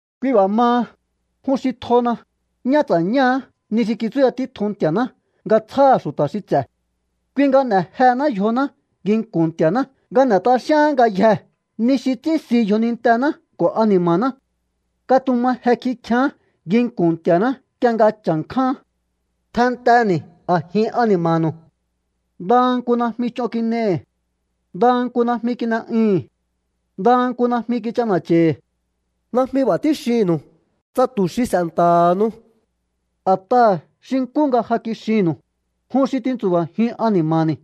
Kui b'a̱ maha, jun xi tjona, ñá ts'a̱ñáá ni xi kitsúya títjun Nti̱a̱ná nga tsjáha̱ xu̱ta̱ xi ts'e̱. Kui nga n'e̱ jehená yjoná nginku̱n Nti̱a̱ná nga n'e̱ t'axíaán ngayjee̱ ni xi ts'ínsi yjonintená ko̱ ani̱ma̱ná. Katuma je kikjián nginku̱n Nti̱a̱ná nk'ie nga chja̱nkjáán. Tjennteni̱ a̱jin ani̱ma̱nu̱u. Ndaha nku najmi ch'on kin'ei̱hi̱. Ndaha nku najmi kin'e'ui̱hi̱n. Ndaha nku najmi kich'ana̱cha̱i̱hi̱. Najmi b'a̱ tíxinnu̱u tsa tu̱ xi s'e̱nta̱ha̱nu̱u. A̱t'aha̱ xi nkú nga ja kixinnu̱u, jun xi tintsu̱ba̱jiun ani̱ma̱ni̱,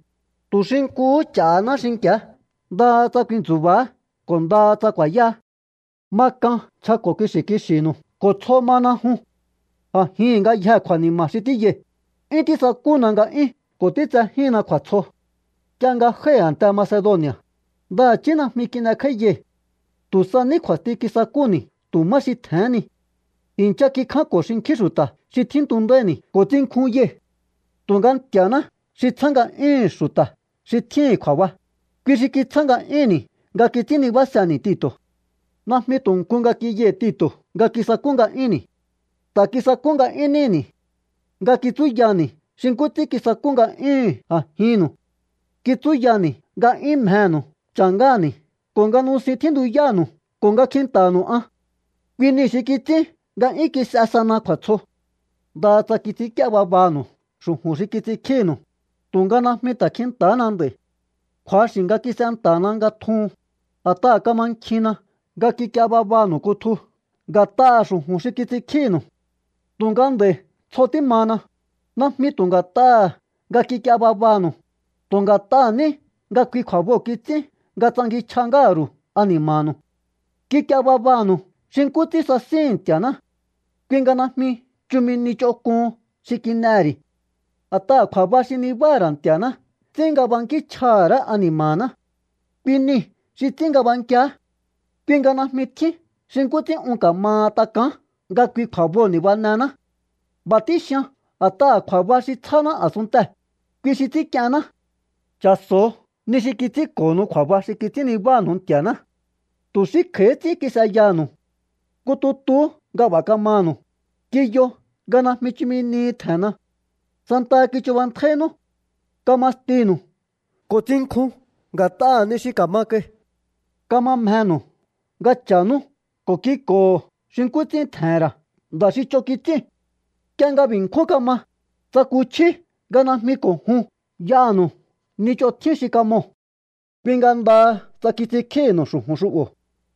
tu̱ xi nkuhú ch'a̱haná xinki̱á ndaha tsa ku̱i̱ntsu̱ba̱á ko̱ ndaha tsa ku̱a̱yáá. Ma k'an nchjako̱ kixi̱ kixi̱nu̱u ko̱ tsjo mana jun. A̱jihi̱n ngayjee̱ kju̱a̱ni̱ma̱ xi tíyai̱, 'yún tísakúna nga'yún ko̱ títsejíhinna kju̱a̱tsjo. Nk'ie nga jái̱ a̱nte Macedoni̱a̱, ndaha̱chí najmi kin'ekj'áíyai̱. Tu̱ sa ní kju̱a̱sti kisakúni̱ tu̱ má xi tje̱hén ni. I̱ncha kikjánko̱ xinkjín xu̱ta̱ xi tjíntundáíni̱ ko̱ tsinkjunyai̱. Tu̱nga Nti̱a̱ná xi tsjá nga'yúhu̱n xu̱ta̱ xi tjíhi̱n kju̱a̱ba, kui xi kitsjá nga'yúnni̱ nga kits'ín nibáseni̱ Tito̱. Najmi tu̱ nku nga kiyai̱ Tito̱ nga kisakú nga'yúnni̱. Ta̱ kisakú nga'yún níni̱ nga kitsúyani̱ xi nkú ts'ín kisakú nga'yúhu̱n a̱jinnu̱u. Kitsúyani̱ nga 'yún mjenu̱u cha̱ ngáha̱ni̱ ko̱ nga nusin tjíntuyánu̱u ko̱ nga kjinta̱ha̱nu̱u an. Kui niu̱ xi kits'ín nga 'yún kis'e sana kju̱a̱tsjo. Ndaha tsa kits'ínk'íé babanu̱u xu̱ju̱n xi kits'inkjínu̱u, tu̱nga najmi ta̱ kjinta̱hana nd'a̱i̱. Kju̱axi̱ nga kis'enta̱na nga tjuhun, a̱t'aha̱ kamankjinna nga kik'ie babanu̱u kutju nga̱t'aha̱ xu̱ju̱n xi kits'inkjínu̱u. Tu̱nga nd'a̱i̱ tsjo tímana, najmi tu̱ nga̱t'aha̱ nga kik'ie babanu̱u, tu̱ nga̱t'aha̱ ní nga kui kju̱a̱boo̱ kits'ín nga tsankinchj'a ngáha̱ ru̱u ani̱ma̱nu̱u. Kik'ie babanu̱u xi nkú ts'ín sasíhi̱n Nti̱a̱ná. Kui nga najmi chumi ni ch'onk'uhun xi kin'ehe̱ ri̱. A̱t'aha̱ kju̱a̱ba xi nibáha̱ ra̱ Nti̱a̱ná ts'ín nga bankíchj'aha̱ ra̱á ani̱ma̱ná. Kui niu̱ xi ts'ín nga b'ankiá. Kui nga najmi tjín xi nkú ts'ín un ka̱maha tak'aán nga kui kju̱a̱boo̱ ni̱banehená. B'a̱ tíxian a̱t'aha̱ kju̱a̱ba xi tsjáná a̱sunntee̱, kui xi ts'ínk'ienná. Cha̱so̱o ni xi kits'ínko̱nu̱u kju̱a̱ba xi kits'ín nibánu̱u Nti̱a̱ná. Tu̱ xí kj'a̱íhí ts'ín kis'eyanu̱u. Nku tutuhú nga b'a̱ kamanu̱u, kiyo nga najmi chumi nihi tje̱nna. Santaha kichubantjáínú. Kama stinu̱u ko̱ tsinkjun nga̱t'aha̱ ni xi ka̱ma kai. Kama mjenu̱u nga cha̱nú ko̱ kik'o̱ho̱ xi nkú ts'ín tje̱he̱n ra̱ nda̱ xi ch'on kits'íu̱n. Nk'ie nga b'i̱ nkjún kama, tsakuchjíú nga najmi ko̱ jun y'aha̱nu̱u ni ch'on tjín xi kamoo̱. Kui nga ndaha tsa kits'inkjíhi̱nu̱u xu̱ju̱n xu'bo̱,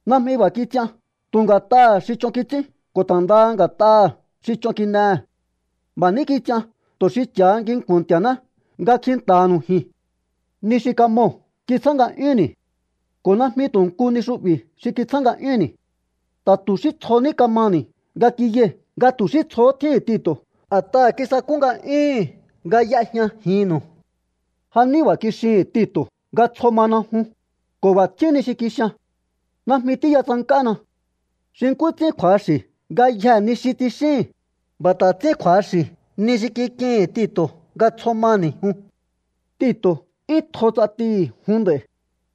najmi b'a̱ kits'ian tu̱ nga̱t'aha̱ xi ch'on kits'ín ko̱ ta̱ ndaha nga̱t'aha̱ xi ch'on kin'ehe̱. B'a̱ ní kits'ian tu̱ xi cha̱ha nginku̱n Nti̱a̱ná nga kjinta̱ha̱nu̱u ji̱n. Ni xi kamoo̱ kitsjá nga'yúnni̱. Ko̱ najmi tu̱ nku ni xu'bi̱ xi kitsjá nga'yúnni̱. Ta̱ tu̱ xí tsjo ní kamani̱ nga kiyai̱ nga tu̱ xí tsjohó tjíhi̱n Tito̱ a̱t'aha̱ kisakú nga'yúhu̱n nga y'ejñajinnu̱u. Ja ní b'a̱ kixihi̱n Tito̱ nga tsjo mana jun, ko̱ b'a̱ tjín ni xi kixian. Najmi tíya tsank'ána. Xi nkú ts'ín kju̱axi̱ ngayjee̱ ni xi tsixíi̱hi̱n, b'a̱ ta̱ ts'ín kju̱axi̱ ni xi kik'ihi̱n Tito̱ nga tsjo mani̱ jun. Tito̱ 'yún tjo ts'atihi̱ jun nd'a̱i̱,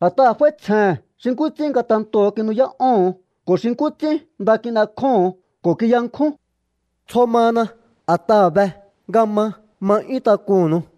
a̱t'aha̱ f'áítsjehe̱n xi nkú ts'ín ngatentoo̱ kinu'yá'óho̱on ko̱ xi nkú ts'ín nda kin'ekjóho̱on ko̱ kiyankjún. Tsjo mana, a̱t'aha̱ be nga ma ma 'yún tak'unnu̱u.